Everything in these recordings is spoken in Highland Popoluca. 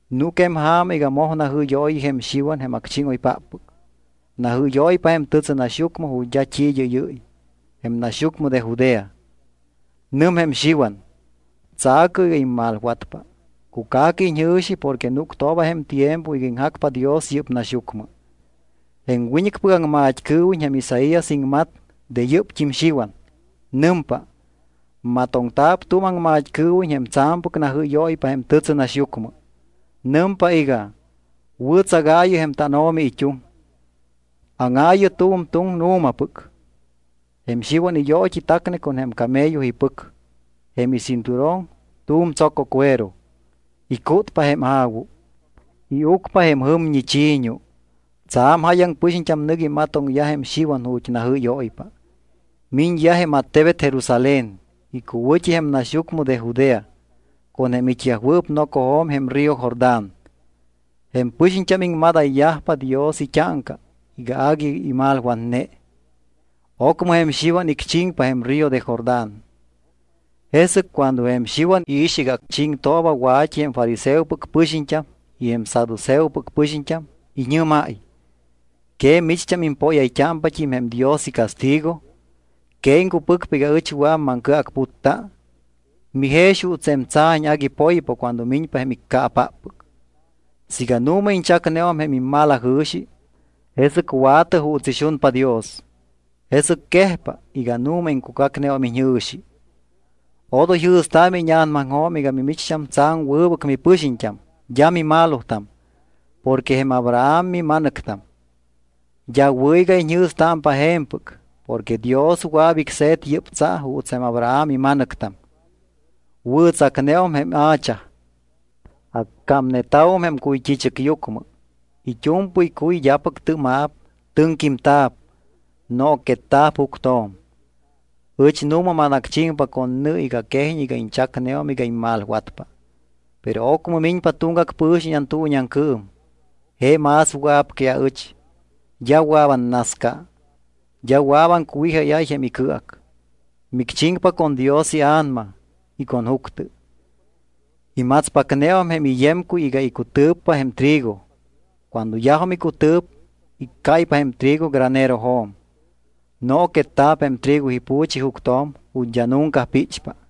Núc jém ja̱ma iga moj najɨ́yooyi jém Xiwan jém acchíŋoypáppɨc. Najɨ́yóypa jém tɨtsɨnaxyucmɨ ju̱t́ d́a t́i id́ɨ́yɨ́y, jém naxyucmɨ de Judea. Nɨm jém Xiwan: —Tsa̱cɨ iga immalwatpa, cuca̱cɨ iñjɨ̱xi porque núctooba jém tiempo iga iŋjacpa Dios yɨ́p naxyucmɨ. Jém wiñɨcpɨc aŋmat́cɨɨwiñ jém Isaías iŋmat de yɨ́pt́im Xiwan. Nɨmpa: Matoŋta̱p tu̱m aŋmat́cɨɨwiñ jém tsa̱mpɨc najɨ́yóypa jém tɨtsɨnaxyucmɨ. Nɨmpa iga: “Wɨ̱tsagaayɨ jém tánO̱mi it́uŋ. Áŋaayɨ tu̱m tuŋ nu̱mapɨc.” Jém Xiwan iyoot́i tacne con jém camello ipɨc. Jém icinturón tu̱m tsococuero. Icútpa jém a̱wu. Iucpa jém jɨmñi chi̱ñu. Tsa̱m jáyaŋ pɨxiñt́am nɨc imatoŋyaj jém Xiwan ju̱t́ najɨ́yóypa. Miñyaj jém attebet Jerusalén, icuwɨ̱t́i jém naxyucmɨ de Judea, con jém it́yajwɨɨp nocojo̱m jém río Jordán. Jém pɨxiñt́am iŋmadayyajpa Dios it́áŋca iga agui imalwatne. Ocmɨ jém Xiwan icchiŋpa jém río de Jordán. Jesɨc cuando jém Xiwan iix iga chiŋtooba wa̱t́i jém fariseopɨc pɨxiñt́am y jém saduceopɨc pɨxiñt́am, iñɨ́máy: —¿Que micht́am impóyayt́ámpat́im jém Dios icastigo? ¿Que iŋcupɨcpa iga ɨch wɨa̱p maŋcɨacputta? Mijex juuts jém tsa̱ñ agui poypa cuando miñpa jém iccaapáppɨc. Siiga nu̱ma iñchacneum jém immalajɨ̱xi, jesɨc wa̱tɨ juuts ixunpa Dios, jesɨc quejpa iga nu̱ma iŋcucacneum iñjɨ̱xi. Odoy jɨ̱staamɨ íña̱namaŋjo̱m iga mimicht́am tsa̱m wɨbɨc mipɨxiñt́am d́a mimalotam porque jém Abraham mima̱nɨctam. D́a wɨ̱ iga iñjɨ̱stámpa je̱mpɨc porque Dios wɨa̱p icse̱t yɨ́p tsa juuts jém Abraham ima̱nɨctam. Wɨ̱tsacneum jém hacha. Accámneta̱wum jém cuyt́i̱chɨcyucmɨ. It́u̱mpɨy cuy d́apɨc tɨ́ma̱p, tɨŋquímta̱p, nooquetta̱p juctjo̱m. Ɨch nu̱ma manacchiŋpa con nɨ iga quejiñ iga iñchacneum iga immalwatpa. Pero ocmɨ miñpa tuŋgac pɨ̱xiñ antuuñiaŋcɨɨm. Je más wɨa̱p que aɨch. D́a wɨa̱p annasca. D́a wɨa̱p aŋcuwijáyáy jém icɨac. Micchiŋpa con Dios iA̱nama y con juctɨ. Imatspacneum jém iyemcuy iga icutɨ̱ppa jém trigo. Cuando yajum icutɨ̱p, iccáypa jém trigo granerojo̱m. Nooquetta̱p jém trigo ipu̱chi juctjo̱m ju̱t́ d́a nunca píchpa.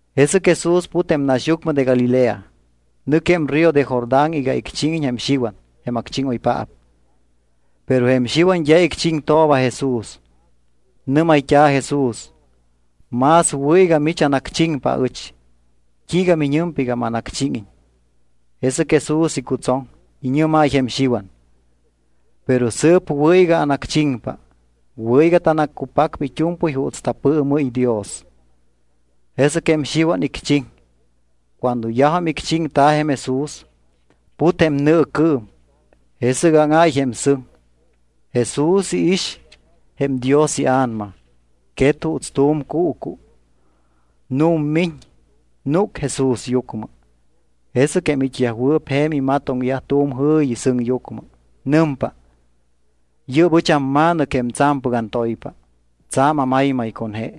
Jesɨc Jesús put jém naxyucmɨ de Galilea. Nɨc jém río de Jordán iga icchíŋiñ jém Xiwan jém acchíŋoypaap. Pero jém Xiwan d́a icchiŋtooba Jesús. Nɨ́mayt́a̱ Jesús: —Más wɨ̱ iga mich anacchiŋpa aɨch. ¿T́iiga mimiñpa iga manacchíŋiñ? Jesɨc Jesús icutsoŋ. Iñɨ́máy jém Xiwan: —Pero sɨɨp wɨ̱ iga anacchiŋpa. Wɨ̱ iga tanaccupacpa it́u̱mpɨy juuts tapɨɨmɨ́y Dios. Jesɨc jém Xiwan icchiŋ. Cuando yajum icchiŋta̱ jém Jesús, put jém nɨɨcɨɨm. Jesɨc áŋáy jém sɨŋ, Jesús iix jém Dios iA̱nama. Quet juuts tu̱m cuucu. Nu̱mmiñ, núc Jesúsyucmɨ. Jesɨc jém it́yajwɨɨp je̱m imatoŋyaj tu̱m jɨ̱yi sɨŋyucmɨ. Nɨmpa: —Yɨ́p ɨch amMa̱nɨc jém tsa̱mpɨc antoypa. Tsa̱m amaymay con je.